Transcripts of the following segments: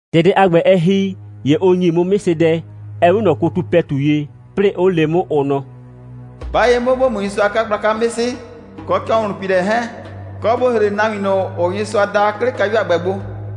‑Tɛ dɛ a ‑gbɛ, ɛ ‑hi, ‑ye ʋ ‑nyi 'mʋ 'mɩsɩdɛ, ‑ɛ 'we ꞊nɔ kotu ‑pɛtu ye, 'plɩɩ, 'ʋ le 'mʋ, ʋ nɔ: «'Ba ye 'mʋ, ‑bo mu Nyɩsʋa a 'kagblaka 'mɩsɩ, kɔ ‑cɔhlʋnpiilɛ 'hɛɛn, kɔ, ‑bo ‑hre nahuin ꞊nʋ, ‑ʋʋ Nyɩsʋa da, 'ke 'le kayu a ‑gbɛ gbo.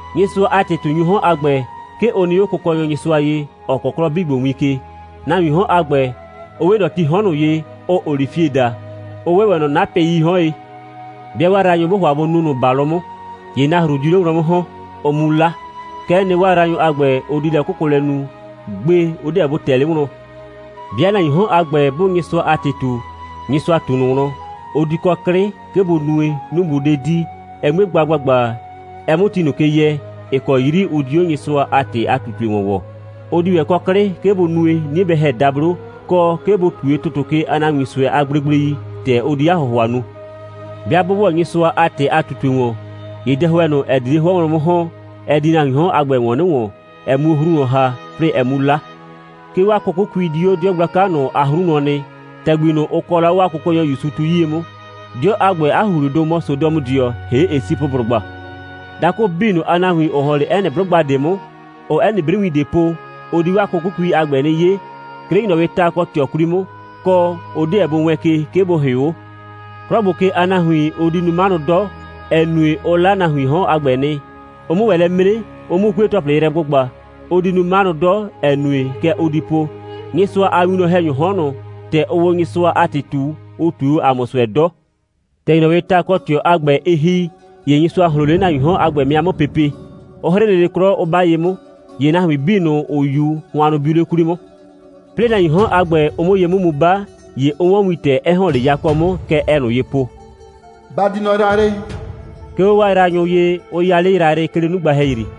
Nyɩsʋa a ‑tɩ꞊tunyʋʋ 'hɔn a ‑gbɛ, 'ke ʋ nɩ 'o Kʋkɔnyɔ Nyɩsʋa ye, ‑ɔ kɔɔ 'klɔ 'bii ‑gbo win ke. Nahuiin 'hɔn a ‑gbɛ, ʋ 'we ꞊nɔ tii 'hɔn ꞊nʋ ye, ʋʋ olifieti daa, 'ʋ 'we ‑wɛ ꞊nɔ 'napɩii 'hɔn ye. 'Bɩa 'waa yraanyʋ, 'bʋʋ ‑hʋa bʋ nu ꞊nʋ ‑balʋ 'mʋ, ‑ye nahru diu 'le wlɔn 'mʋ ‑hɔn, ʋ 'mu 'la. Kɛ'ɛ nɩ, 'waa yraanyʋ a ‑gbɛ, ʋ di lɛ'kʋkʋlɛ nu. Gbe, ʋ 'deɛ bʋ ꞊tɛ 'le wlɔn. 'Bɩa nahuiin 'hɔn a ‑gbɛ, 'bʋʋ Nyɩsʋa a ‑tɩ ꞊tu, Nyɩsʋa ꞊tu ꞊nʋ wlɔn, ʋ di kɔ 'klɩ, 'ke bʋ nue, 'nu bʋ 'de di, ɛ 'mue gba ‑gbagba, ɛ 'mʋ ti ꞊nʋ ke yɛ, ‑ɩ kɔ 'yri ʋ di 'o Nyɩsʋa a ‑tɩ a ꞊tutue ‑wɔn ‑wɔɔ; 'ʋ di ‑wɛ 'klɩ kɔ, 'ke bʋ nue, 'nie bɛ ‑hɛ dablo, kɔ, 'ke bʋ ꞊tue ‑tʋtʋ ke a nahuin ꞊sʋɛ a gblegblei, ‑tɛ ʋ di 'a ‑hʋhʋa nu. 'Bɩa 'bʋ ‑wɔ Nyɩsʋa a ‑tɩ ꞊nʋ a ꞊tutue ‑wɔn, ‑ye dɛhʋɛ ꞊nʋ, ‑ɛ di 'le 'hʋɔ wlɔn 'mʋ ‑hɔn, ɛ di nahuiin 'hɔn a ‑gbɛ ‑wɔn 'nɩ ‑wɔn, ɛ 'mu 'o 'hru wlɔn ‑ha, 'plɩɩ ɛ 'mu 'la. 'Ke 'waa 'kʋkʋkui di 'o 'dɩɔ gblaka ꞊nʋ a 'hru wlɔn nɩ, ‑tɛgbi ꞊nʋ, ʋ kɔɔ la 'o 'waa Kʋkɔnyɔ ‑Yusu tu 'yie 'mʋ. 'Dɩɔ a ‑gbɛ a ‑huhlidʋ mɔ Sodɔmʋdɩɔ, ‑hee' Esipʋblʋgba. Dakʋ 'bii ꞊nʋ a nahuin, ‑ʋ ‑hɔn 'le 'ɛ nɩ 'blʋgba ꞊de 'mʋ, ‑ʋʋ 'ɛ nɩ 'briwin ꞊de po, ʋ di 'waa 'kʋkʋkui a ‑gbɛ 'nɩ 'ye, 'ke 'le ‑nyrɔwɩɩ ta kɔ ꞊tɩɔ 'kwli 'mʋ, kɔ, ʋ 'deɛ bʋ wɛɛn ke, 'ke bʋ ‑hɩʋ 'o. 'Klɔ ‑gbo ke a nahuin, ʋ di nu 'manʋ 'dɔ, ‑ɛ nue, ʋ 'la nahuiin 'hɔn a ‑gbɛ nɩ, ʋ 'mʋ ‑wɛ lɛ 'mre, ʋ 'mʋ 'kue‑tɔplɩ yrɛ gbʋgba. Ʋ di nu 'manʋ 'dɔ, ‑ɛ nue, kɛ ʋ di po: «Nyɩsʋa a winwlɔn‑hɛnyʋʋ 'hɔn ꞊nʋ, ‑tɛ ʋʋ o Nyɩsʋa a ‑tɩ ꞊tu, ʋ ꞊tue o ‑a mʋ ꞊sʋɛ 'dɔ.» ‑Tɛ ‑nyrɔwɩɩ ta kɔ ꞊tɩɔ a ‑gbɛ, ɩ ‑hi, ‑ye Nyɩsʋa ꞊hloon 'le nahuiin 'hɔn a ‑gbɛ 'mɩa 'mʋ pepe, 'ʋ 'hrɩ lele 'klɔ, 'ʋ 'ba ye 'mʋ. ‑Ye nahuin 'bii ꞊nʋ, ‑ʋ 'yu, hʋannʋ biu 'le 'kwli 'mʋ. 'Plɩɩ nahuiin 'hɔn a ‑gbɛ, ʋ 'mʋ ye 'mʋ mu 'ba, ‑ye ʋ 'wɔn wintɛ, 'ɛ ‑hɔn 'le yakɔ 'mʋ. Kɛ ɛɛ ꞊nʋ ye po: «Ba di nɔ yrayrɩ!» 'ke 'o 'waa yraanyʋ ye, 'ʋ 'ya 'le yrayrɩ, 'ke 'le 'nugba ‑hɛyri.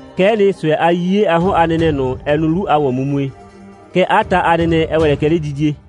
Kɛ'ɛ nɩ, ꞊sʋɛ a 'yiye a 'hɔn a nɛnɛ ꞊nʋ, ɛ nu 'lu a ‑wɔnmumue. Kɛɛ, 'a ta a nɛnɛ, ɛ ‑wɛ lɛ kɛ 'ledidie.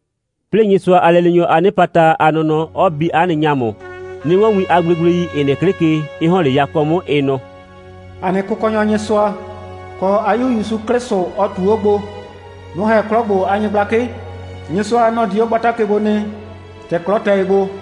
'Plɩɩ, Nyɩsʋa a lɛleenyɔ a 'nɩpata a nɔnɔ, 'ɔ bi 'a nɩ ‑ŋamʋ, 'nɩ 'wɔn win a gblegblei, ‑ɩ nɩ 'klɩ ke, 'ɩ ‑hɔn 'le yakɔ 'mʋ, ɩ nɔ: «‑A nɩ Kʋkɔnyɔ Nyɩsʋa, kɔ 'a 'Yu ‑Yusu 'Klɩsʋ, ɔ ꞊tu 'o gbo, nʋ‑ ‑hɛ 'klɔ ‑gbo a nyɩgblakɩ. Nyɩsʋa, nɔ‑ di 'o gbata ke gbo nɩ, ‑tɛ 'klɔ tɛ ye gbo.»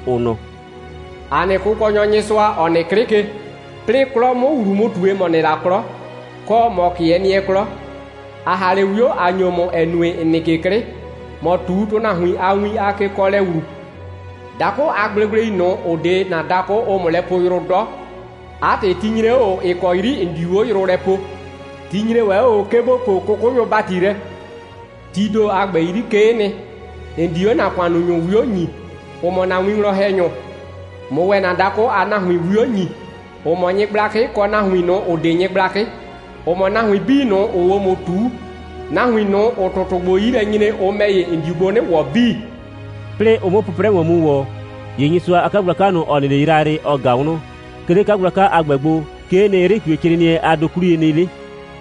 ʋ nɔ: «‑A nɩ Kʋkɔnyɔ Nyɩsʋa, ‑ɔ nɩ 'klɩ ke, 'plɩɩ 'klɔ 'mʋ ‑wlu mu ꞊tue, ‑mɔ nɩ la 'klɔ, kɔ, ‑mɔ 'kɩɛ nɩɛ 'klɔ, ‑a ‑ha 'le 'wio, ꞊a ‑nyo ‑mʋ, ‑ɛ nue, ‑n nɩ ke 'klɩ, ‑mɔ ꞊tu nahuin a win a kekɔɔlɛ ‑wlu. Dakʋ a gblegblei ꞊nʋ, ‑ʋ 'de ‑na dakʋ, ʋʋ ‑mʋ lɛ poo yrʋ 'dɔ. 'A ‑tɩ, ti nyre 'o ꞊o, ‑ɩ kɔ 'yri ‑n diu 'o yrʋ lɛ poo. Ti nyre ‑wɛ 'o ꞊o, 'ke ‑bo poo 'kʋkʋnyʋ ‑bati lɛ. Tii ‑do a ‑gbɛ 'yri, 'kee nɩ, ‑n di 'o ‑na ‑kʋannunyʋ 'wio ‑nyii, ‑ʋ mɔ ‑na winwlɔn‑hɛnyʋ, ꞊mʋ ‑wɛ ‑na dakʋ a nahuin 'wio ‑nyi, ‑ʋ mɔ nyɩgblakɩ, kɔ nahuin ꞊nʋ, ‑ʋ 'de nyɩgblakɩ, ‑ʋ mɔ nahuin 'bii ꞊nʋ, ‑ʋʋ 'o ‑mʋ ꞊tuu. Nahuin ꞊nʋ, ‑ʋʋ ‑tʋtʋ ‑gbo 'yi lɛ nyre, ʋ ‑mɛ ‑ye, ‑n diu gbo 'nɩ ‑wɔ 'bii.» 'Plɩɩ ʋ 'mʋ 'pʋprɛ ‑wɔn mu ‑wɔ, ‑ye Nyɩsʋa a 'kagblaka ꞊nʋ, ‑ɔ nɩ 'le yrayrɩ, ɔ ꞊ga wlɔn. 'Ke 'le 'kagblaka a ‑gbɛ gbo, 'kee nɩ, 'yrɩ꞊tuecrɩɩnɩɛ a dokwliye nɩ 'le,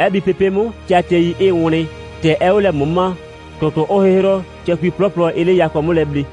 'ɛ bi pepe' 'mʋ, tɩatɩɛi 'ɩɩ wlɩn, ‑tɛ 'ɛɛ 'o lɛ ꞊mʋma, ‑tʋtʋʋ 'ʋʋ 'hɩhrɔ, cɛkui 'plɔplɔ 'ɩɩ 'le yakɔ 'mʋ lɛ ble.